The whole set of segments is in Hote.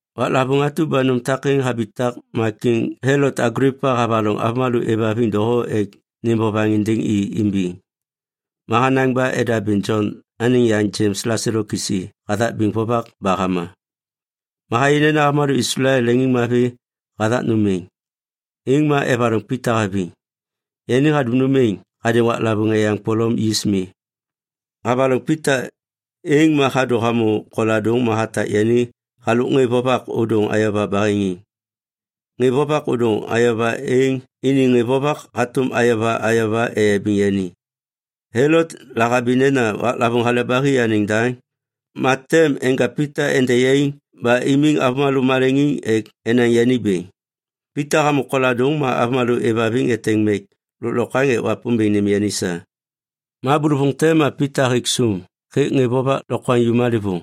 Waklavôŋ atu ba nôm takêŋ habitak ma Kiŋ Helot Aglipa havaloŋ avômalô êvhaviŋ doho ek nêm vovaŋ êndêŋ i imbiŋ. Ma hanaŋ ba edabêŋ Jon anêŋ yaŋ Jems laselo kisi hathak biŋ vovak ba hama. Ma hayê nena avômalô Islael leŋiŋmavi hathak nôm êŋ, êŋ ma evaloŋ Pita haviŋ. Yani hadum nôm êŋ hadêŋ waklavôŋ Eyaŋ Polom Yis Mi. Havaloŋ Pita, êŋ ma hadô hamô koladôŋ ma hatak yani halôk ŋê vovak ôdôŋ ayova baheŋiŋ. Ŋê vovak ôdôŋ ayova êŋ iniŋ ŋê vovak hatôm ayova ayova eyabiŋ yani. Helot lahabi nena waklavôŋ Hale ba Hi anêŋ daŋ, ma tem enja Pita ende yaiŋ ba imiŋ avômalô maleŋiŋ ek enaŋ yani bêŋ. Pita hamô koladôŋ ma avômalô êvhaviŋ eteŋ mek lôklokwaŋ ek Wapômbêŋ nêm yani sa. Ma bôlôvôŋ te ma Pita hêk sôm hêk ŋê vovak lokwaŋju malêvôŋ.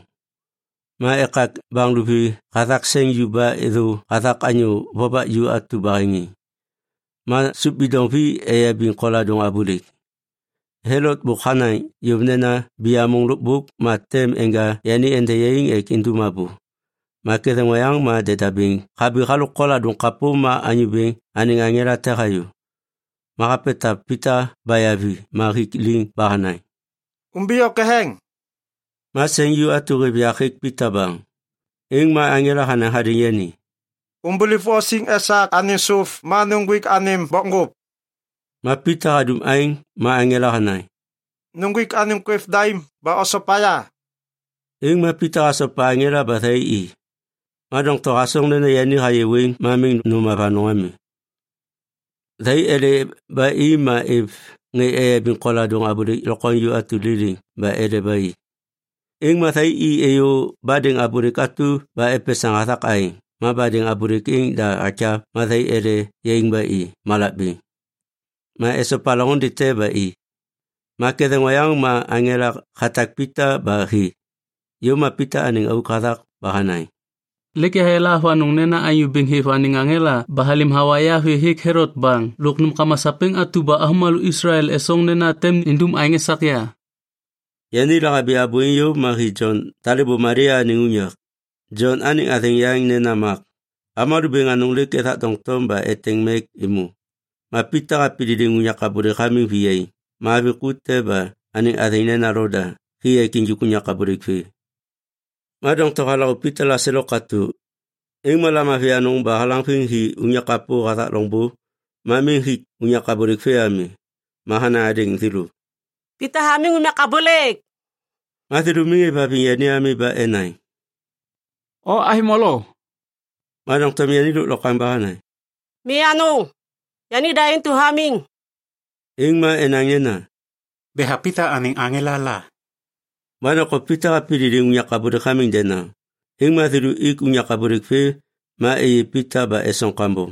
Ma ekak baŋ luvi hathak seŋ ju ba êthô hathak anyô vovak ju atu baheŋiŋ. Ma sôp bidoŋ vi eyabiŋ koladôŋ abôlêk. Helot bôk hanaŋ yôv nena biyamôŋ lôkbôk ma tem neja yani ende yaiŋ ek indum abô. Ma ketheŋ oyaŋ ma deda bêŋ habi halôk koladôŋ kapô ma Anyô Bêŋ anêŋ aŋela te hayô. Ma hapetav Pita baya vi ma hik liŋ ba hanaŋ, “Umbiyô ketheŋ!” Ma seŋ ju atu hêv yak hêk Pita baŋ. Êŋ ma aŋela hanaŋ hadêŋ yani, “Umbuliv o siŋ esak anêm sôp ma nuŋgwik anêm bokŋgôp.” Ma Pita hadum aêŋ ma aŋela hanaŋ, “Nuŋgwik anêm kwêv daim ba osopa ya.” Êŋ ma Pita hasopa aŋela ba thai i, ma doŋtom hasoŋ nena yani hayê wêŋ ma miŋ nôm avanôŋ ami. Thai ele ba i ma êv ŋê eyabiŋ koladôŋ abôlêk lokwaŋju atu liliŋ ba ele ba i. Êŋ ma thai i êyô badêŋ abôlêk atu ba epesaŋ hathak aeŋ, ma badêŋ abôlêk êŋ da hakyav ma thai ele yaiŋ ba i malak bêŋ. Ma esopa loŋôndê te ba i. Ma ketheŋ oyaŋ ma aŋela hatak Pita ba hi. Yôv ma Pita anêŋ auk hathak ba hanaŋ, “Lêk yahayala avanôŋ nena Anyô Bêŋ hêv anêŋ aŋela ba halêm hawa ya vê hêk Helot baŋ lôk nômkama sapêŋ atu ba avômalô Islael esoŋ nena tem nindum aêŋ esak ya.” Yani lahabi abô êŋ yôv ma hi Jon talêbô Malia anêŋ unyak. Jon anêŋ athêŋ yaŋ nena Mak. Avômalô bêŋ anôŋ lêk ethak doŋtom ba eteŋ mek êmô. Ma Pita hapididiŋ unyak abôlêk hamiŋ viyaiŋ ma avi ku te ba anêŋ athêŋ nena Loda, hi ek injik unyak abôlêk vê. Ma doŋtom halaŋô Pita laselo katô, êŋ ma lamavi anôŋ ba halaŋviŋ hi unyak kapô hathak loŋbô ma miŋ hik unyak abôlêk vê ami. Ma hanaŋ hadêŋ thêlô, “Pita hamiŋ unyak abôlêk!” Ma thêlô miŋ êvhaviŋ yani ami ba enaŋ, “O avi molo.” Ma doŋtom yani lôklokwaŋ ba hanaŋ, “Mi anôŋ, yanida intu hamiŋ.” Êŋ ma enaŋ nena, “Betha Pita anêŋ aŋela la.” Ma doŋtom Pita hapididiŋ unyak abôlêk hamiŋ denaŋ. Êŋ ma thêlô ik unyak abôlêk vê ma êyê Pita ba esoŋ kambom.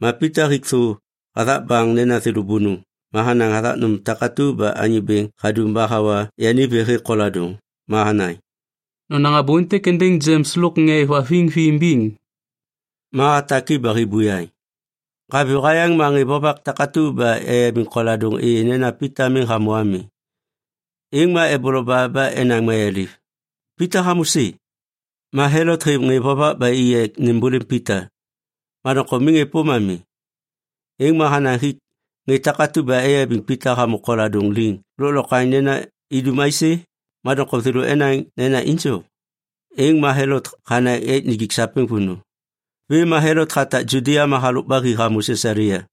Ma Pita hik thô hathak baŋ nena thêlô bônôŋ ma hanaŋ hathak nôm takatu ba Anyô Bêŋ hadum ba hawa yani vê hêk koladôŋ. Ma hanaŋ, “Nonaŋ abô êntêk êndêŋ Jems lôk ŋê êvhaviŋ vi imbiŋ.” Ma hatak i ba hi buyaŋ. Haviyô hayaŋ ma ŋê vovak takatu ba eyabiŋ koladôŋ êyê nena Pita miŋ hamô ami. Êŋ ma eboloba ba enaŋ mayaliv, “Pita hamô sê?” Ma Helot hêv ŋê vovak ba i ek nêmbôlêm Pita, ma doŋtom miŋ êpôm ami. Êŋ ma hanaŋ hik ŋê takatu ba eyabiŋ Pita hamô koladôŋ liŋ lôklokwaŋ nena idum aisê? Ma doŋtom thêlô enaŋ nena injo. Êŋ ma Helot hanaŋ ek nijik sapêŋ vônô. Vêm ma Helot hatak Judia ma halôk ba hi hamô Sisalia.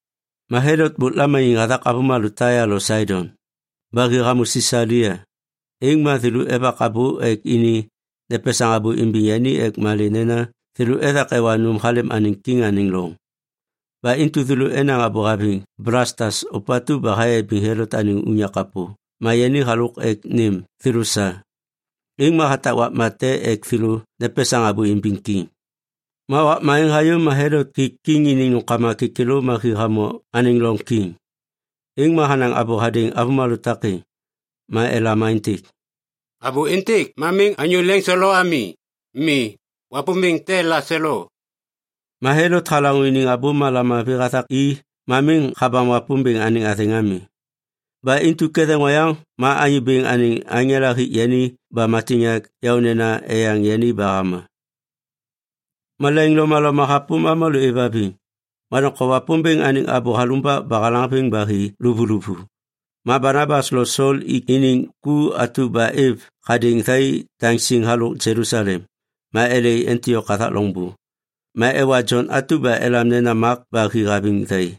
Ma Helot bôk lamaniŋ hathak avômalô Taia lo Saidon. Ba hi hamô Sisalia, êŋ ma thêlô evak abô ek ini nepesaŋ abô imbiŋ yani ek malê nena thêlô ethak ewa nôm halêm anêŋ kiŋ anêŋ loŋ. Ba intu thêlô enaŋ abô haviŋ Blastas ôpatu ba hayabiŋ Helot anêŋ unyak kapô ma yani halôk ek nêm thêlô sa. Êŋ ma hatak wakma te ek thêlô nepesaŋ abô imbiŋ kiŋ. Ma wakma êŋ hayô ma Helot hik kiŋ iniŋ nômkama kêkêlô ma hi hamô anêŋ loŋ kiŋ. Êŋ ma hanaŋ abô hadêŋ avômalô takêŋ. Ma elam aêntêk, “Abô êntêk ma miŋ anyô leŋselo ami. Mi, wapômbêŋ te laselo.” Ma Helot halaŋô iniŋ abô ba lamavi hathak i ma miŋ habam Wapômbêŋ anêŋ athêŋ ami. Ba intu ketheŋ oyaŋ ma Anyô Bêŋ anêŋ aŋela hik yani ba matiŋyak yaônena eyaŋ yani ba hama. Malaiŋ lomaloma hapôm avômalô êvhaviŋ, ma doŋtom Wapômbêŋ anêŋ abô halumbak ba halaŋviŋ ba hi luvuluvu. Ma Banabas lo Sol ik iniŋ ku atu ba êv hadêŋ thai daŋ siŋ halôk Jelusalem, ma ele i Antiok hathak loŋbô. Ma ewa Jon atu ba elam nena Mak ba hi haviŋ thai.